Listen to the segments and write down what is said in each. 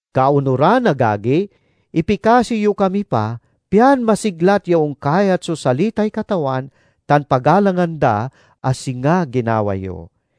Kaonuran, agagi, ipikasi yo kami pa, pian masiglat ya onkayat so salitay Katawan, tan pagalangan da a singa ginawa yo.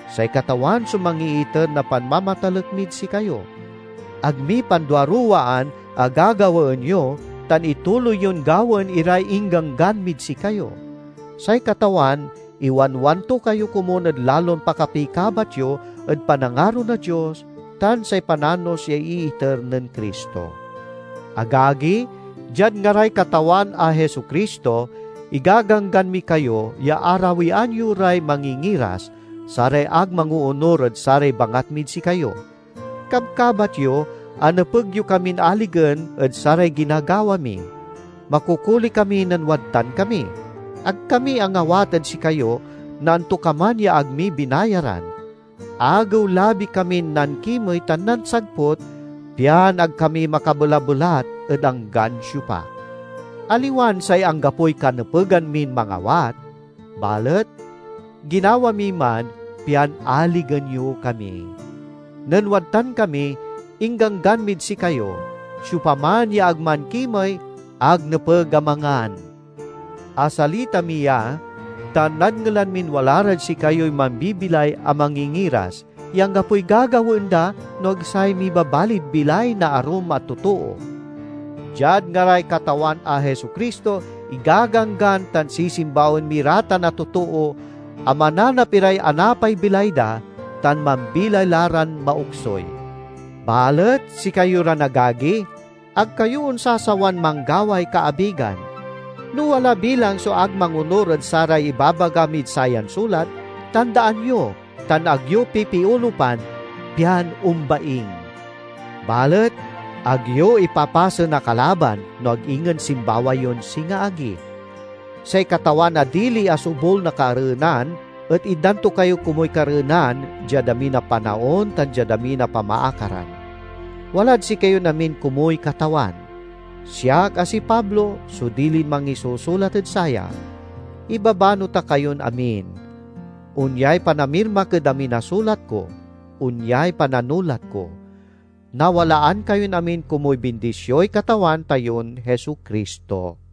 Say Katawan so mangiiter na panmamatalek mid sikayo; ag mi panduaruwaan a gagawaen yo, tan ituloy yon gawaen iray ingganggan mid sikayo. Say Katawan iwanwan to kayo komun ed lalon pakapikabat yo ed panangaro na Dios tan say pananos ya iiter nen Cristo. Agagi, diad ngaray Katawan a Jesu-Cristo igaganggan mi kayo ya arawian yo ray mangingiras, saray ag mangoonur ed saray bangat mid sikayo. Kabkabat yo a nepeg yo kamin aligen ed saray ginagawa mi. Makokoli kami nen wadtan kami. Ag kami angawat ed sikayo na antokaman ya ag mi binayaran. Agew-labi kamin nankimey tan nansagput, pian ag kami makabelabelat ed anggan siopa. Aliwan say anggapoy kanepegan min mangawat, balet ginawa mi man pian aligen yo kami. Nen wadtan kami ingganggan mid sikayo, "Siopaman ya ag mankimey, ag nepeg a mangan." Asalita mi ya ta nadngelan min wala rad sikayoy mambibilay a mangingiras, ya anggapoy gagawaen da no ag say mibabalid bilay na arum a totoo. Diad ngaray Katawan a Jesu-Cristo, igaganggan tan sisimbawaen mi ra tan a totoo, a mananap iray anapay bilay da tan mambilay la ran maoksuy. Balet sikayo ran agagi, ag kayo onsasawan manggaway kaabigan. No wala bilang so ag mangonur ed saray ibabaga mid sayan sulat, tandaan yo tan ag yo pipiolupan, pian ombaing. Balet ag yo ipapasen a kalaban, no ag ingen simbawa yon singa agi. Say Katawan a dili a sobul na kareenan et itdan to kayo komuy kareenan diad amin a panaon tan diad amin a pamaakaran. Walad sikayon amin komuy Katawan. Siak, a si Pablo, so dilin mangisusulat ed saya: Ibabano ta kayon amin. Onyay panamirmak ed amin a sulat ko. Onyay pananulat ko. Nawalaan kayon amin komuy bindisioy Katawan tayon Jesu-Cristo.